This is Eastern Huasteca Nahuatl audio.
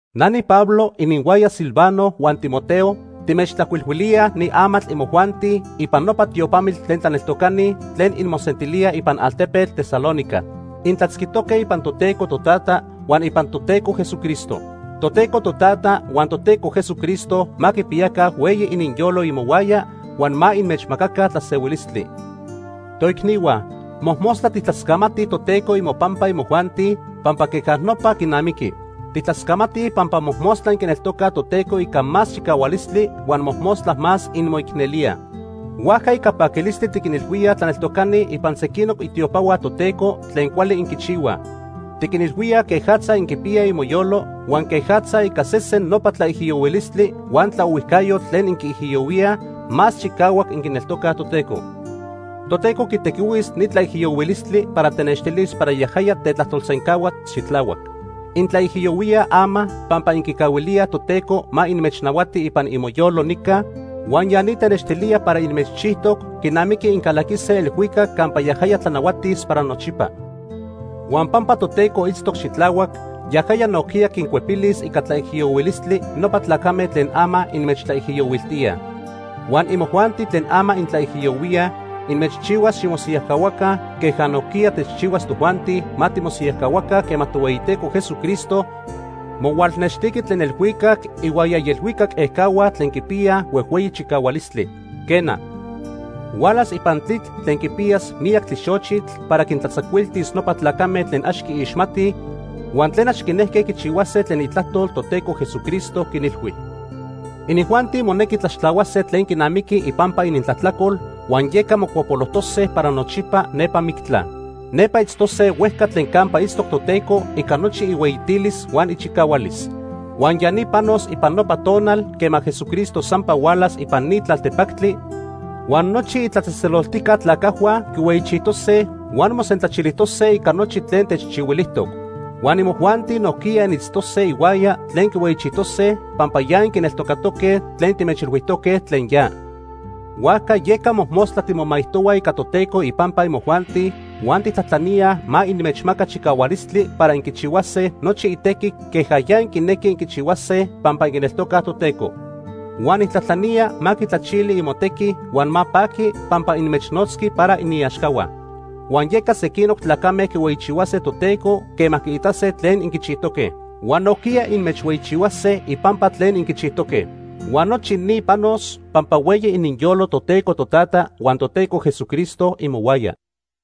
Na niPablo, ininhuaya Silvano huan Timoteo, timechtlajcuilhuilíaj ni amatl imojuanti ipan nopa tiopamitl tlen tlaneltocani tlen inmosentilíaj ipan altepetl Tesalónica. Intlatzquijtoque ipan Toteco Totata huan ipan Toteco Jesucristo. Toteco Totata huan Toteco Jesucristo ma quipiyaca hueyi ininyolo imohuaya huan ma inmechmacaca tlasehuilistli. Toicnihua, mojmostla tijtlascamatij Toteco imopampa imojuanti, pampa queja nopa quinamiqui. Tijtlascamatij pampa mojmostla inquineltocaj Toteco ica más chicahualistli huan mojmostla más inmoicnelíaj. Huajca, ica paquilistli tiquinilhuíaj tlaneltocani ipan sequinoc itiopahua Toteco tlen cuali inquichihuaj. Tiquinilhuíaj quejatza inquipiyaj imoyolo huan quejatza ica sesen nopa tlaijiyohuilistli huan tlaohuijcayotl tlen inquiijiyohuíaj, más chicahuac inquineltocaj Toteco. Toteco quitequihuis ni tlaijiyohuilistli para tenextilis para yajaya tetlajtolsencahua xitlahuac. Intlaijiyohuíaj ama pampa inquicahuilíaj Toteco ma inmechnahuati ipan imoyolo nica huan ya ni tenextilía para inmechchijtoc quinamiqui incalaquise elhuicac campa yajaya tlanahuatis para nochipa. Huan pampa Toteco itztoc xitlahuac, yajaya nojquiya quincuepilis ica tlaijiyohuilistli nopa tlacame tlen ama inmechtlaijiyohuiltíaj. Huan imojuanti tlen ama intlaijiyohuíaj, inmechchihuas ximosiyajcahuaca queja nojquiya techchihuas tojuanti ma timosiyajcahuaca quema Tohueyiteco Jesucristo mohualnextiqui tlen elhuicac ihuaya ielhuicac ejcahua tlen quipiyaj huejhueyi chicahualistli. Quena, hualas ipan tlitl tlen quipiyas miyac tlixochitl para quintlatzacuiltis nopa tlacame tlen ax quiixmatij huan tlen ax quinejque quichihuase tlen itlajtol Toteco Jesucristo quinilhui. Inijuanti monequi tlaxtlahuase tlen quinamiqui ipampa inintlajtlacol, huan yeca mocuapolojtose para nochipa nepa mictla. Nepa itztose huejca tlen campa itztoc Toteco ica nochi ihueyitilis huan ichicahualis. Huan ya ni panos ipan nopa tonal quema Jesucristo sampa hualas ipan ni tlaltepactli huan nochi itlatzejtzeloltijca tlacajhua quihueyichijtose huan mosentlachilijtose ica nochi tlen techchihuilijtoc. Huan imojuanti nojquiya initztose ihuaya tlen quihueyichijtose pampa ya inquineltocaque tlen timechilhuijtoque tlen ya. Huajca yeca mojmostla timomaijtohuaj ica Toteco ipampa imojuanti huan tijtlajtlaníaj ma inmechmaca chicahualistli para inquichihuase nochi itequi queja ya inquinequij inquichihuase pampa inquineltocaj Toteco. Huan nijtlajtlanía ma quitlachili imotequi huan ma paqui pampa inmechnotzqui para iniaxcahua. Huan yeca sequinoc tlacame quihueyichihuase Toteco quema quiitase tlen inquichijtoque, huan nojquiya inmechhueyichihuase ipampa tlen inquichijtoque. Huan nochi ni panos pampa hueyi ininyolo Toteco Totata huan Toteco Jesucristo imohuaya.